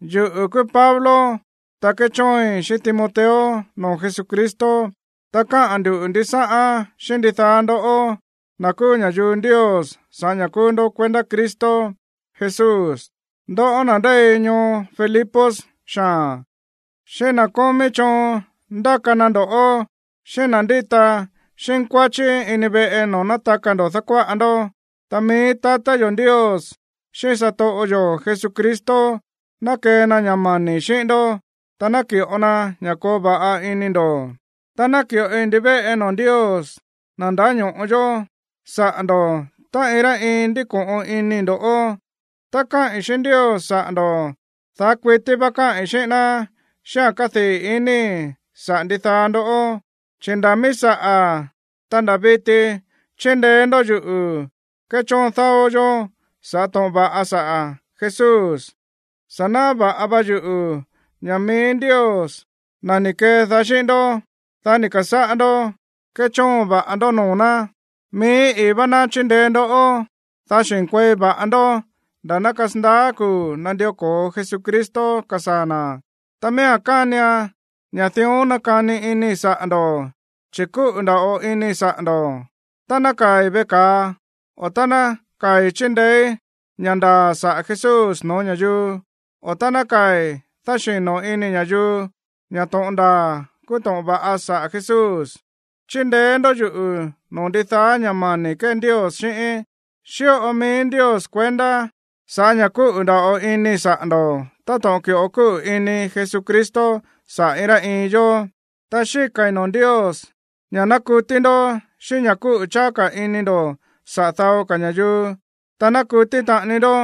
Yuꞌu̱ kúú Pablo, ta kéchóoin xíꞌín Timoteo noo̱ Jesucristo, ta káꞌa̱n ndu̱ ndisáꞌán xíꞌín ndidaá ndoꞌó, na̱ kúú ña̱yuu Ndios sa̱ꞌá ña̱ kúú ndó kuendá Cristo Jesús, ndoꞌó na̱ ndéi ñoo Filipos xaa̱n, xíꞌín na̱ kómí choon ndáka na ndo̱ꞌó, xíꞌín na̱ ndíta xínkuáchí ini veꞌe noo̱ nátaka ndo̱ dákuáꞌa ndó. Ta mií tatá yo̱ Ndios xíꞌín satoꞌo yo̱ Jesucristo ná kee na ña̱ mani̱ xíꞌín ndó, ta ná ki̱ꞌo na ña̱ koo va̱ꞌa ini ndo̱. Ta náki̱ꞌoi ndivéꞌe noo̱ Ndios, na̱ ndáño̱ꞌo yó, saꞌa̱ ndo̱ꞌó tá iin rá iin ndíko̱ꞌon inii̱ ndoꞌó. Tá káꞌi̱n xíꞌín Ndios saꞌa̱ ndo̱, daá kuití vá káꞌi̱n xíꞌín ná xíꞌáa̱n kádii̱ inii̱ saꞌa̱ ndidaá ndoꞌó, chi̱ nda̱ mií saꞌa̱, ta nda̱ viti chíndeé ndó yuꞌu̱ kéchóon dáó yó sa̱ꞌá to̱ꞌon va̱ꞌa saꞌa̱ Jesús. Sa̱ náꞌá va̱ꞌa va yuꞌu̱ ña̱ mií Ndios, na̱ ni̱ kedaá xíꞌín ndó, dá ni̱ ka̱sáꞌá ndó kéchóon va̱ꞌa ndó noo̱ ná, mií i̱í vá ná chíndeé ndó, dá xi̱nkuei va̱ꞌa ndó nda̱ ná kasandaá kuu̱ nandió ko̱o Jesucristo kasaa̱ na̱. Ta miía̱n kánian ña̱ dión nákani inii̱ saꞌa̱ ndo̱, chi̱ kúꞌu̱ nda̱ꞌo inii̱ saꞌa̱ ndo̱. Tá nákaa̱i̱ veꞌe ka̱a, o tá nákaa̱i̱ chíndeéí ña̱ ndaa̱ saꞌa̱ Jesús no̱ó ña̱yuu, o tá nákaa̱i̱ dáxi̱no inii̱ ña̱yuu ña̱ to̱ꞌon ndaa̱ kúú to̱ꞌon va̱ꞌa saꞌa̱ Jesús, chíndeé ndó yuꞌu̱ noo̱ ndidaá ña̱ mani̱ kée Ndios xíꞌíín. Xíꞌo mií Ndios kuendá sa̱ꞌá ña̱ kúꞌu̱ nda̱ꞌo inii̱ saꞌa̱ ndo̱ táto̱ꞌon ki̱ꞌo kúꞌu̱ ini Jesucristo saꞌa̱ iin rá iin yó. Ta xíka̱i̱ noo̱ Ndios ña̱ ná kutí ndó xíꞌín ña̱ kúꞌu̱ cháá ka̱ ini ndo̱ saꞌa̱ dao ka̱ ña̱yuu, ta ná kutí taꞌani ndó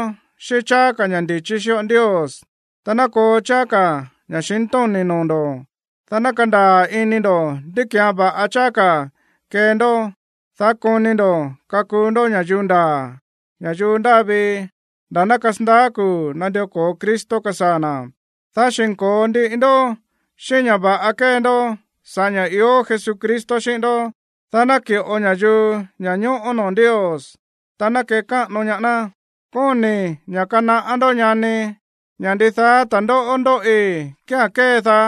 xíꞌín cháá ka̱ ña̱ ndi̱chí xíꞌo Ndios, ta ná koo cháá ka̱ ña̱xintóni̱ noo̱ ndo̱, dá ná kandaa̱ ini ndo̱ ndí ki̱án va̱ꞌa cháá ka̱ kee ndó, dá koni ndo̱ kakuu ndó ña̱yuu ndaa̱, ña̱yuu ndáa vii nda̱ ná kasandaá kuu̱ nandió ko̱o Cristo kasaa̱ na̱, dá xi̱nko̱o ndiꞌi ndó xíꞌín ña̱ va̱ꞌa kée ndó sa̱ꞌá ña̱ ió Jesucristo xíꞌín ndó, dá ná naki̱ꞌo ña̱yuu ña̱ñóꞌó noo̱ Ndios, ta ná kekáꞌano ñaá ná. Kóni̱i̱ ña̱ kanaꞌá ndó, ñanii̱, ña̱ ndidaá ta̱ndóꞌó ndóꞌi kía̱n kédaá,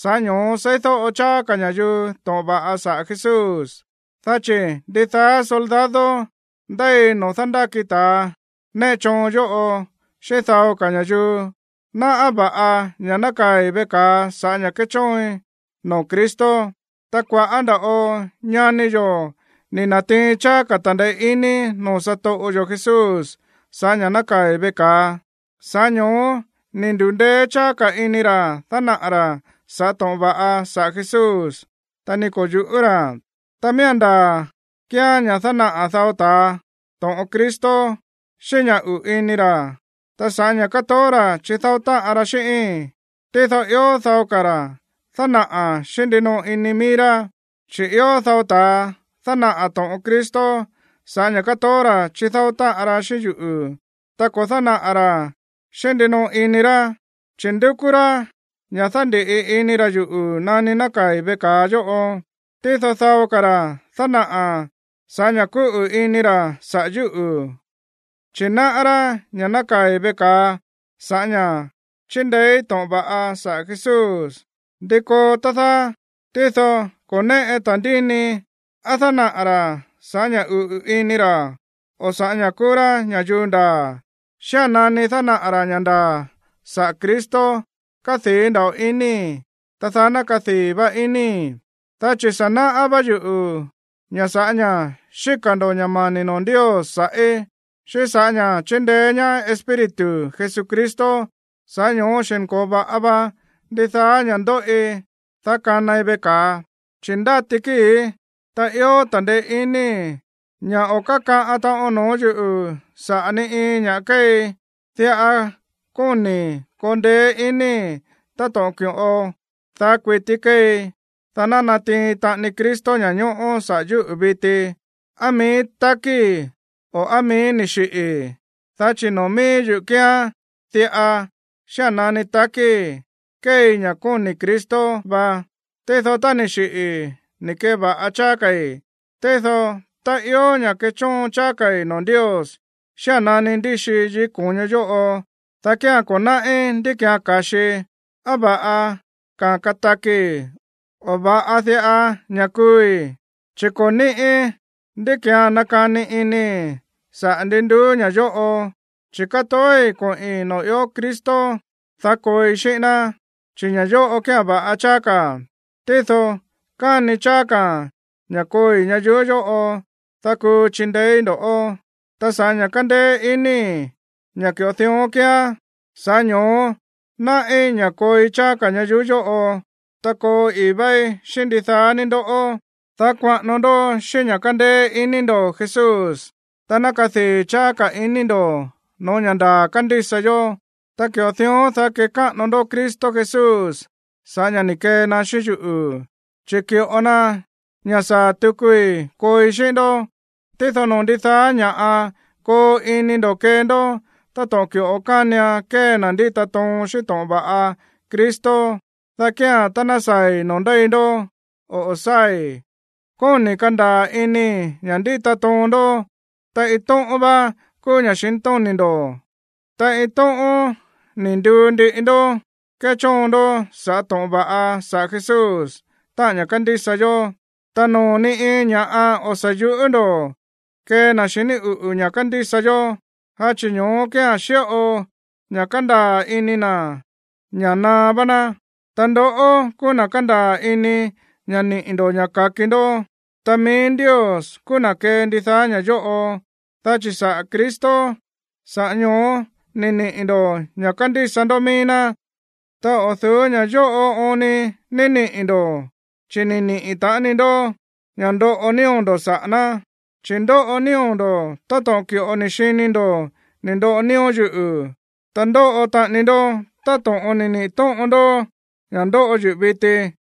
sa̱ꞌá ño̱ó seídóꞌo cháá ka̱ ña̱yuu to̱ꞌon va̱ꞌa saꞌa̱ Jesús. Dá chi̱ ndidaá soldado ndéi noo̱ dándáki ta̱ néꞌe choon yóꞌo xíꞌín dao ka̱ ña̱yuu náꞌá va̱ꞌa ña̱ nákaa̱i̱ veꞌe ka̱a sa̱ꞌá ña̱ kéchóoin noo̱ Cristo. Ta kua̱ꞌá nda̱ꞌo ñani yo̱ ni̱ na̱tiin cháá ka̱ ta̱ndeé iní noo̱ satoꞌo yo̱ Jesús sa̱ꞌá ña̱ nákaa̱i̱ veꞌe ka̱a, sa̱ꞌá ño̱ó ni̱ ndu̱ndéé cháá ka̱ ini ra̱ dánaꞌa̱ ra̱ sa̱ꞌá to̱ꞌon va̱ꞌa saꞌa̱ Jesús, ta ni ko̱ yu̱ꞌú ra̱. Ta miía̱n ndaa̱ kíán ña̱ dánaꞌa̱ dao ta̱a to̱ꞌon Cristo xíꞌín ña̱ uꞌu̱ ini ra̱, ta sa̱ꞌá ña̱ kátoó ra̱ chidáó táꞌan ra xíꞌíi̱n. Tído ió dao ka̱ ra̱ dánaꞌa̱ xíꞌín ndinoꞌo ini mií rá. Chi̱ ió dao ta̱a dánaꞌa̱ to̱ꞌon Cristo sa̱ꞌá ña̱ kátoó ra̱ chidáó táꞌan ra xíꞌín yuꞌu̱, ta ko̱ dánaꞌa̱ ra̱án xíꞌín ndinoꞌo ini ra̱, chi̱ ndúkú rá ña̱ dándi̱ꞌi ini ra̱ yuꞌu̱ nani nákaa̱i̱ veꞌe ka̱a yóꞌo. Tído dao ka̱ ra̱ dánaꞌa̱ sa̱ꞌá ña̱ kúꞌu̱ ini ra̱ saꞌa̱ yúꞌu̱, chi̱ náꞌá rá ña̱ nákaa̱i̱ veꞌe ka̱a sa̱ꞌá ña̱ chíndeéí to̱ꞌon va̱ꞌa sa̱ꞌá Jesús. ¿Ndi koo, tá dáá? Tído ko̱ néꞌe ta̱ndíni á dánaꞌa̱ ra̱ sa̱ꞌá ña̱ uꞌu̱ ini ra̱, o sa̱ꞌá ña̱ kúú rá ña̱yuu ndaa̱. Xía̱n nani dánaꞌa̱ ra̱ ña̱ ndaa̱ saꞌa̱ Cristo, kádii̱ nda̱ꞌo inii̱, ta daá ná kadii̱ va inii̱. Dá chi̱ sa̱ náꞌá vá yuꞌu̱ ña̱ sa̱ꞌá ña̱ xíka̱ ndo̱ ña̱ mani̱ noo̱ Ndios sa̱ꞌí, xíꞌín sa̱ꞌá ña̱ chíndeé ñaá Espíritu Jesucristo, sa̱ꞌá ño̱ó xi̱nko̱o va̱ꞌa va ndidaá ña̱ ndóꞌi, dá kanai veꞌe ka̱a, chi̱ ndáti kíi̱í, ta ió ta̱ndeé iníi̱ ña̱ o̱ kákaꞌan taꞌon noo̱ yúꞌu̱ sa̱ꞌá ni iin ña̱ꞌa kéei. Diꞌa kóni̱i̱ koo ndeé iníi̱, táto̱ꞌon ki̱ꞌo daá kuití kéei, dá ná natiin taꞌani Cristo ña̱ñóꞌó saꞌa̱ yúꞌu̱ viti, á mií takíi̱ o á mií ni̱ xiꞌi̱i̱. Dá chi̱ noo̱ mií yuꞌu̱ kíán diꞌa: xía̱n nani takíi̱, kéei ña̱ kóni̱ Cristo va, tído tá ni̱ xiꞌi̱i̱, ni̱ ke̱va̱ꞌa cháá ka̱i̱. Tído tá ió ña̱ kechóon cháá ka̱i̱ noo̱ Ndios xía̱n nani ndíxii yikí ko̱ño yóꞌo, dá kía̱n ko̱ náꞌí ndí ki̱án ka̱xii, á va̱ꞌa ka̱ katakii̱, o á va̱ꞌa diꞌa ña̱ kuui̱. Chi̱ ko̱ ni̱ꞌí ndá ki̱án nakani inii̱ saꞌa̱ ndi nduú ña̱ yóꞌo, chi̱ katoói̱ koꞌi̱n noo̱ ió Cristo, dá kooi xíꞌín ná, chi̱ ña̱ yóꞌo kía̱n va̱ꞌa cháá ka̱a̱n. Tído káni cháá ka̱a̱n ña̱ kooi ñayuú yóꞌo, dá kuu chindeéí ndo̱ꞌó. Ta sa̱ꞌá ña̱ kándéé inii̱ ña̱ ki̱ꞌo dión kíán, sa̱ꞌá ño̱ó náꞌí ña̱ kooi cháá ka̱ ñayuú yóꞌo, ta koo i̱í váí xíꞌín ndidaá ní ndo̱ꞌó, dá kuaꞌano ndó xíꞌín ña̱ kándéé iní ndo̱ Jesús, dá ná kadii̱ cháá ka̱ ini ndo̱ no̱ó ña̱ ndaa̱ kándísa yó. Ta ki̱ꞌo dión, dá kékáꞌano ndó Cristo Jesús sa̱ꞌá ña̱ ni̱ kee na xíꞌín yuꞌu̱, chi̱ ki̱ꞌo na ña̱ saa̱ tukui kooi xíꞌín ndó. Tído noo̱ ndidaá ña̱ꞌa koo ini ndo̱ kee ndó táto̱ꞌon ki̱ꞌo kánian kee na̱ ndíta toon xíꞌín to̱ꞌon va̱ꞌa Cristo, dá kía̱n tá ná saa̱i̱ noo̱ ndéi ndó o o̱ sáa̱i̱, kóni̱i̱ kandaa̱ inii̱ ña̱ ndíta toon ndó, ta iin tóꞌón vá kúú ña̱xintóni̱ ndo̱, ta iin tóꞌón ni̱ nduu ndiꞌi ndó kéchóon ndó sa̱ꞌá to̱ꞌon va̱ꞌa saꞌa̱ Jesús, táꞌa̱n ña̱ kándísa yó. Ta noo̱ ni iin ña̱ꞌa o̱ sa̱ yuꞌú ndo̱ kee na̱ xiní uꞌu̱ ña̱ kándísa yó, dá chi̱ ño̱ó kía̱n xíꞌo ña̱ kándaa̱ ini na̱ ña̱ naá vá ná. Ta ndoꞌó kúú na̱ kándaa̱ ini ña̱ niꞌi̱ ndo̱ ña̱ ka̱ki ndó, ta mií Ndios kúú na̱ kee ndidaá ña̱ yóꞌo. Dá chi̱ saꞌa̱ Cristo, sa̱ꞌá ño̱ó ni̱ niꞌi̱ ndo̱ ña̱ kándísa ndó mií ná, ta o̱ du̱ú ña̱ yóꞌo oon ni ni̱ niꞌi̱ ndo̱, chi̱ ni̱ niꞌi̱ taꞌani ndó ña̱ ndóꞌo nío̱ ndo̱ saꞌa̱ ná. Chi̱ ndóꞌo nío̱ ndo̱ táto̱ꞌon ki̱ꞌo ni̱ xini ndo̱ ni̱ ndoꞌo nío̱ yuꞌu̱, ta ndóꞌo taꞌani ndó táto̱ꞌon ni̱ niꞌi̱ tóꞌon ndó ña̱ ndóꞌo yuꞌu̱ viti.